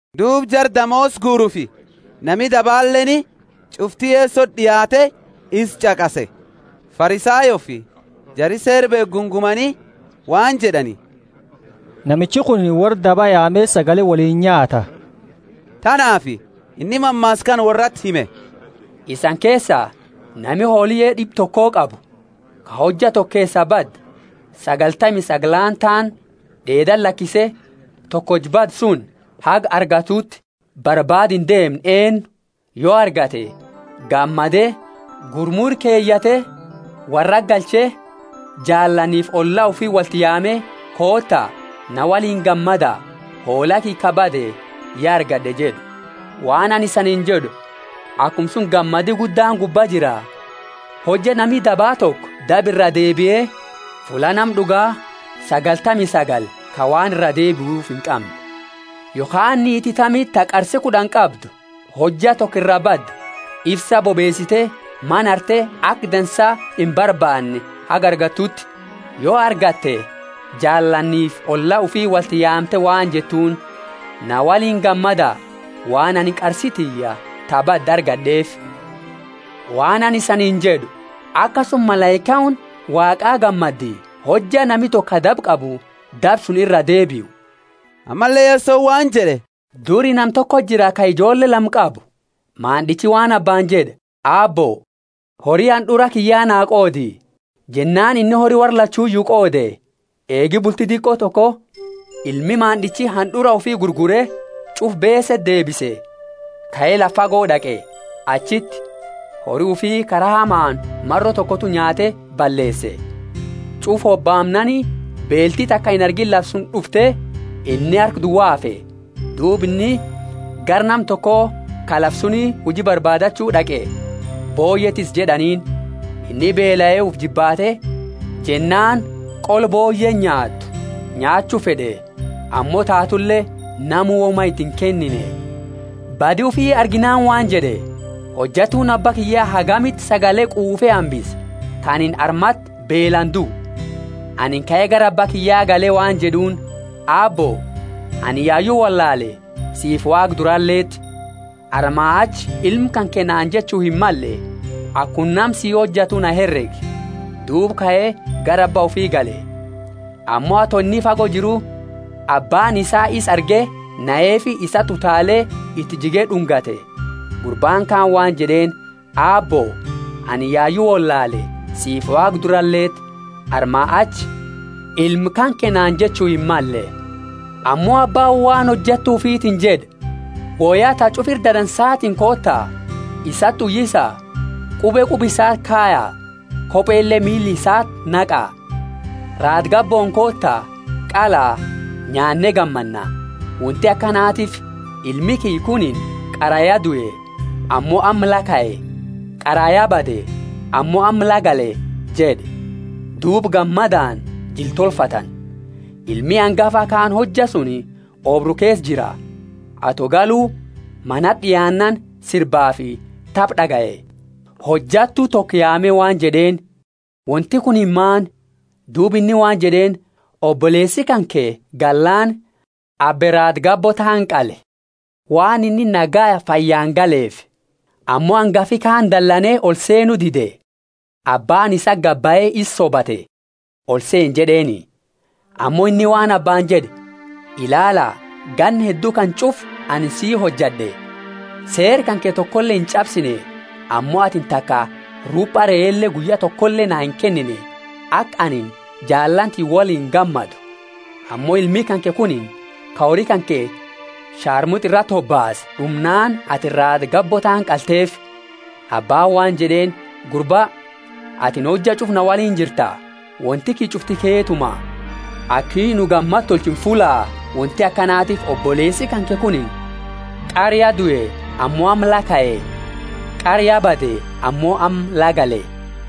Duuba jara damoosa guurufi nami dabaleeni ch'ufti Yesoti d'iaate isa ch'aqase. Farisayoofi jari Seera beekhu gungumani waan jed'ani, Namichi kunini worra daba yaame sagale woliini nyaata. Tanaafi inni mammaasa kana worrati hime: Isani keesa, nami hooliye d'ibba toko qabu, ka hojja toko keesaa bade sagaltami sagalaani taani d'eedati lakise tokocha bade suni, haga argatuuti, barbaada indeemne eennu? Yo argate, gammade gurmu ira keyate, worrati galche, jaalaanifi olla ufi wolti yaame, Koota, na woliini gammada, hoola kiyya ka bade ya argad'e jed'u. Waan anini isaniini jed'u, Akuma suni gammadi guddaani gubba jira, hojja nami daba toko daba iraa deebie, fulla nama d'uga sagaltami sagali ka waan iraa deebiufi inqamne. Yokhaani niiti tamiti ta qarsi kud'ani qabdu, hojja toko iraa bade ifsa bobeesite mana harte aka dansa imbarbaanne haga argattuuti? Yo argatte, jaalaanifi olla ufi wolti yaamte waan jettuuni, Na woliini gammada, waan anini qarsi tiyya ta badde argad'eefi. Waan anini isaniini jed'u, Akasuma malaikaani Waaqa gammaddi, hojja nami toko ka daba qabu daba suni iraa deebiu. Ammalle Yesoni waan jed'e, Duri nama tokoti jira ka ijoolle lama qabu. Maand'ichi waan Abbaani jed'e, Aabbo, hori hand'ura kiyya naa qoodi. Jennaani inni hori worra, lachuyu qoode. Eegi bulti diqo toko ilmi maand'ichi hand'ura ufi gurgure, ch'ufa beese deebise, kae lafa fago d'aqe; achiti hori ufi kara hamaani maro tokotu nyaate balleese. Ch'ufa hobaamnaani beelti taka inargiini lafa suni d'ufte, inni harka duwa hafe. Duuba inni gara nama toko ka lafa suni huji barbaadachu d'aqe. Booyye tissi jed'aniini. Inni beelae ufi jibbaate jennaani qola booyyeeni nyaattu nyaachu fed'e, ammo taatule namu woma iti inkennine. Badi ufi arginaani waan jed'e, Hojattu Abba kiyya hagamiti sagale quufe hambisa, ka anini armati beelaani duu. Anini kae gara Abba kiyya gale waan jed'uuni, Aabbo, anini yayu wollaale, siifi Waaqa duraleti. Armaa achi ilma kanke naani jechu himmalle; akuma nama sii hojatu na heregi. Duuba kae gara abba ufi gale. Ammo ato inni fago jiru, Abbaani isaa isa arge naheefi isati utaale iti jige d'ungate. Gurbaani kaani waan jed'eeni, Aabbo, anini yayu wollaale, siifi Waaqa duraleti. Armaa achi ilma kanke naani jechu himmalle. Ammo Abbaani waan hojattu ufitiini jed'e, Woya ta ch'ufa ira dansaatiini koota, isati uyisa, qube quba isati kaya, kopele miila isati naqa. Raada gabbooni koota, qala, nyaanne gammanna. Wonti akanatiifi ilmi kiyya kunini qara ya due ammo amma la kae; qara ya bade ammo amma la gale jed'e. Duuba gammadaani jila tolfatani. Ilmi angafa kaani hojja suni oobru keesa jira. Ato galu manati d'iaannaani, sirbafi taba d'agaye. Hojattu toko yaame waan jed'eeni, Wonti kunini maani? Duuba inni waan jed'eeni, Oboleesi kanke gallaani abbe raada gabbo taani qale, waan inni nagayaa fayyani galeefi. Ammo angafi kaani dalane oli seenu dide. Abbaani isati gadi bahe isa sobate, Oliseeni jed'eeni. Ammo inni waan abbaani jed'e, Ilaala ganna heddu kana ch'ufa anini si hojad'e, seera kanke tokole inch'absine, ammo atini taka rupa reele guyya tokole naa inkennine, aka anini jaalaani tiyya woliini gammadu. Ammo ilmi kanke kunini ka hori kanke sharmut'a irati hobaase d'umnaani atini raada gabbo taani qalteefi. Abbaani waan jed'eeni, Gurba, atini hojja ch'ufa na woliini jirta, wonti kiyya ch'ufti keetuma. Aki nu gammada tolchinu fullaa; wonti akanatiifi oboleesi kanke kunini qara ya due ammo amma la kae, qara ya bade ammo amma la gale.